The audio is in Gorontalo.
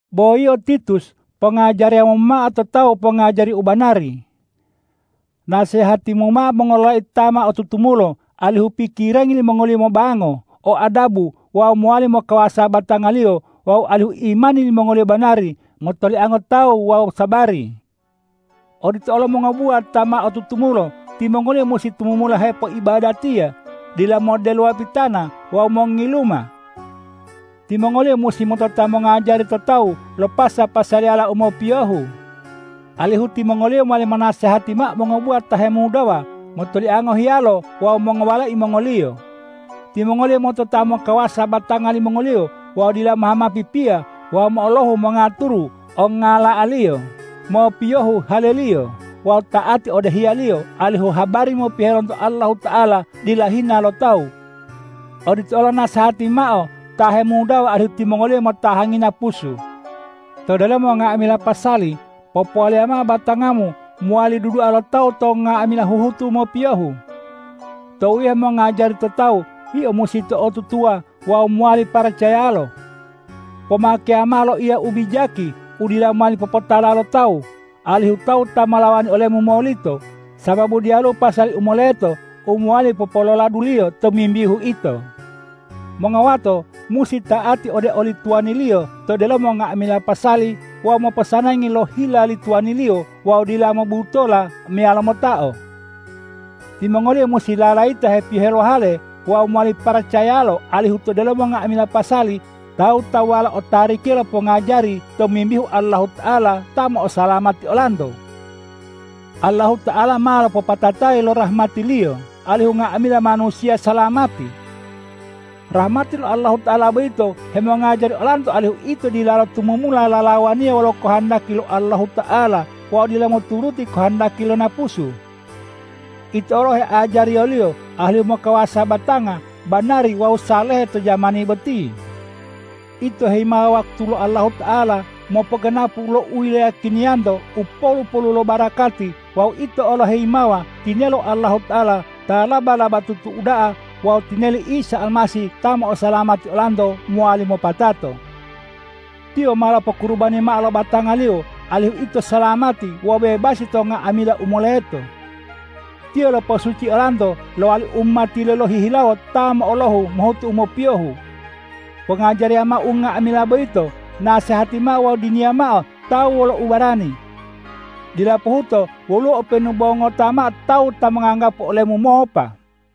Bo yio Titus, pongajariyamu mao to tawu pongajari u banari. Nasehatimu mao mongololai ta ma otutumulo alihu pikirangi limongoliyo mobango, o adabu wawu mowali mokawasa batangaliyo wawu alihu imani limongoliyo banari, motoliango tawu wawu sabari. Odito olo mongobuwa ta ma otutumulo, timongoliyo musi tumumula hepoibadatiya, dila moddelowa pitana wawu mongiluma. Timongoliyo musi motota mongajari to tawu lo pasa-pasaliyala u mopiyohu, alihu timongoliyo mowali monasehati mao mongobuwa ta hemudawa motoliango hiyalo wawu mongowalai mongoliyo. Timongoliyo motota mokawasa batanga limongoliyo wawu dila mohhamawa pipiya, wawu mo'olohu mongaturu ongngala'aliyo, mopiyohu haleliyo wawu ta'ati ode hiyalo, alihu habari mopiyohe lonto Allahuta'ala dila hina lo tawu. Odito olo nasehati mao ta hemudawa alihu timongoliyo motahangi napusu. To delomo nga'amila pasali, popowaliya mao batangamu mowali dudua lo tawu to nga'amila huhutu mopiyohu. Tou yio mongajari to tawu, yio musi to'otutuwa wawu mowali paracayalo. Pomakeya mao loiya u bijaki u dila mowali popotala lo tawu, alihu tawu ta molawani olemu molito, sababu diyaluwo pasali u moleto u mowali popololaduliyo tomimbihu ito. Mongowato musi ta'ati ode oli tuwaniliyo to delomo nga'amila pasali wawu moposanangi lo hila li tuwaniliyo wawu dila mobutola meyalo motao. Timongoliyo musi lalayita hepiyohe lo hale wawu mowali paracayalo, alihu to delomo nga'amila pasali tawu-tawuwalo otarikiya lo pongajari tomimbihu Allahuta'ala ta mo'osalamati olanto. Allahuta'ala ma lopopatatayi lo rahmati-Liyo alihu nga'amila manusiya salamati. Rahmati lo Allahuta'ala boyito hemongajari olanto alihu ito dilalo tumumula lalawaniya wolo kohondaki lo Allahuta'ala wawu dila moturuti kohondaki lo napusu. Ito olo heajariyoliyo alihu mokawasa batanga, banari wawu salehe to jamani boti. Ito heyimawa wakutu lo Allahuta'ala mopoganapu lo u iloyiyakiniyanto u polu-polu lo barakati wawu ito olo heyimawa tinelo Allahuta'ala ta laba-labatutu uda'a wawu tineli Isa Almasih ta mo'osalamati olanto mowali mopatato. Tiyo ma lopokurubani mao lo batanga-Liyo, alihu ito salamati wawu bebasi to nga'amila u moleto. Tiyo lopo'osuci olanto lowali umati-Liyo lohihilawo ta mo'olohu mohutu u mopiyohu. Pongajariya mao unga'amila boyito, nasehati mao wawu diniya mao tawu wolo ubarani. Dila pohuto woluwo openu bo ngota mao tawu ta monganggapu olemu mopa.